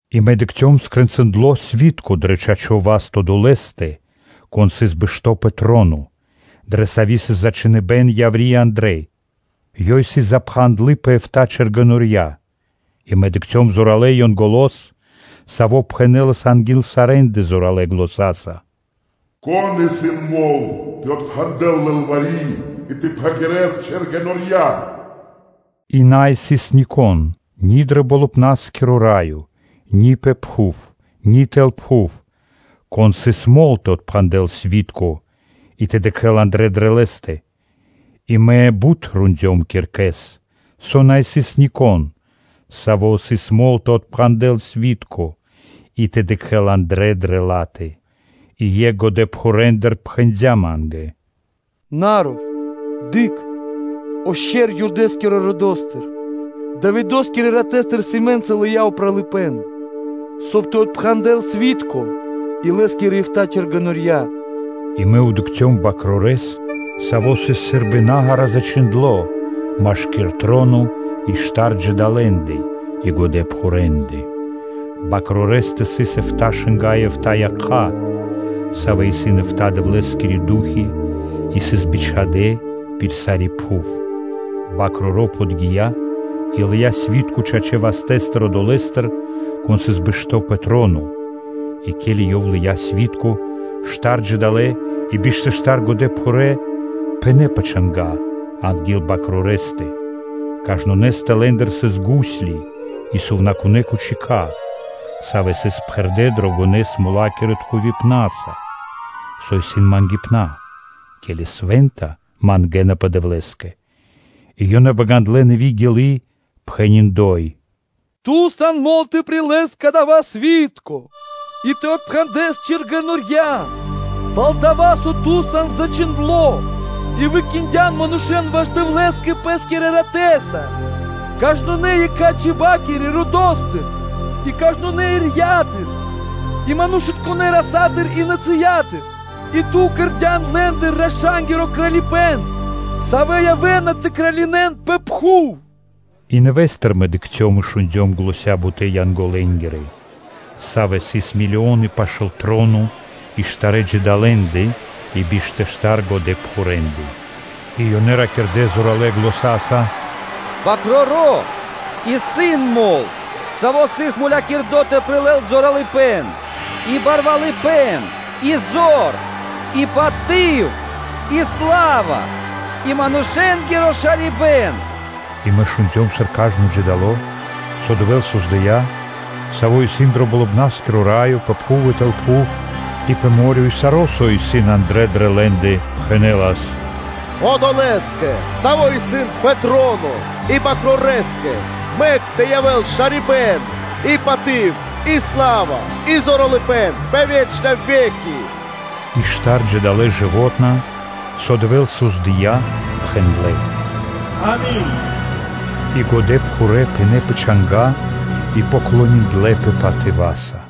И Мэ дыкхцём скрэнцындло сви́тко дро чачо́ (право) васт Одолэ́стэ, Кон сыс бэшто́ пэ троно, дрэ саво́ сыс зачхиныбэна яври́ и андрэ́. Ёв сыс запхандло пэ эфта́ чэргэнорья (печати). И мэ дыкхцём зоралэ́ Янголо́с, саво́ пхэнэлас анги́л сарэ́ндэ зоралэ́ заня́са: “Кон исын мол тэ отпхандэл лылвари́ и тэ пхагирэл чэргэнорья?” И на сыс нико́н ни дро Болыбна́скиро Раё, ни пэ пхув, ци тэл пхув, конэ́скэ сыс мол тэ отпхандэл сви́тко и тэ дыкхэ́л андрэ́ дрэ лэ́стэ. И мэ рондём киркэс бут, со на сыс нико́н, саво́ сыс мол тэ отпхандэл сви́тко и тэ дыкхэ́л андрэ́ дрэ ла́тэ. И екх годэпхурэндыр пхэндя́ ма́нгэ: “На ров! Дыкх! О Шчэр (Ле́во) Юда́скирэ родо́стыр, Давидо́скирэ ратэстыр, сэмэ́нца, лыя́ упралыпэ́н, соб (кай)/ёв тэ дэл ра́да тэ отпхандэл сви́тко и лэ́скирэ эфта́ чэргэнорья.” И мэ дыкхцём Свэнтонэ́ Бакрорэс, Саво́ сыс сы́рбы нагара зачхиндло́ машки́р троно и штар джидалэндэ и годэпхурэндэ. Свэнтонэ́ Бакрорэстэ сыс эфта́ шынга́ (ро́ги) и эфта́ якха́, савэ́ исын эфта́ Дэвлэ́скирэ Ду́хи и сыс бичхадэ́ пир сари́ пхув. Свэ́нто Бакроро́ подги́я и лыя́ сви́тко чачэ́ вастэ́стыр Одолэ́стыр, Кон сыс бэшто́ пэ троно. И ке́ли Ёв лыя́ сви́тко, штар джидалэ (жывотна) и биш тэ штар годэпхурэ́ пынэ́ пэ чанга́ анги́л Свэнтонэ́ Бакрорэстэ. Кажнонэ́стэ лэ́ндыр сыс гусли и сувнакунэ́ тахтая́ (чашы), савэ́ сыс пхэрдэ́ фимиамоса дрогонэ́-смолакирэ тхувипнаса (фимиамоса), со исын патерья (молитвы), ке́ли свэ́нта мангэ́напэ Дэвлэ́скэ. И ёнэ багандлэ нэви́ гилы́, пхэни́: “Ту сан мол тэ прилэс кадава́ сви́тко и тэ отпхандэс чэргэнорья (печати), пал-дова́ со Ту са́нас зачхиндло́ и Ту выкиндян манушэ́н ваш Дэвлэ́скэ Пэ́скирэ ратэ́са кажнонэ́ екхэ́-чиба́кирэ ирья́тыр (сэм΄я́тыр) и кажнонэ́ родыцо́стыр, и манушытконэ́ нацыя́тыр и кхэритконэ́ родо́стыр. И Ту кэрдя́н лэ́ндыр раша́нгиро Кралипэ́н, савэ́ явэ́на тэ кралинэн пэ пхув.” И нэвэ́стыр мэ дыкхцём и шундём заня́ бутэ́-Янголэ́нгирэ, савэ́ сыс милионы пашы́л троно и штарэ́ джидалэндэ и биш тэ штар годэпхурэндэ, и ёнэ ракирдэ́ зоралэ́ заня́са: “Свэ́нто Бакроро́ исын мол, Саво́ сыс мулякирдо тэ прилэл зоралыпэ́н и барвалыпэ́н и зор, и паты́в, и сла́ва и манушэ́нгиро шарибэ́н.” И мэ шундём, сыр кажно джидало, савэ́с Дэвэ́л создыя́, саво́ исын дро Болыбна́скиро Раё, пэ пхув и тэл пхув, и пэ мо́рё (дэрья́в), и саро́, исын андра́л дрэ лэ́ндэ, пхэнэнас: “Одолэ́скэ, Саво́ исын пэ троно, и Свэнтонэ́ Бакрорэскэ, мэк тэ явэ́л шарибэ́н, и паты́в, и сла́ва и зоралыпэ́н пэ вечна ве́ки.” И штар джидалэ (жывотна), савэ́н Дэвэ́л создыя́, пхэндлэ́: “Ами́нь!” И годэпхурэ́ пынэ́ пэ чанга́ и поклониндлэпэ патыва́са.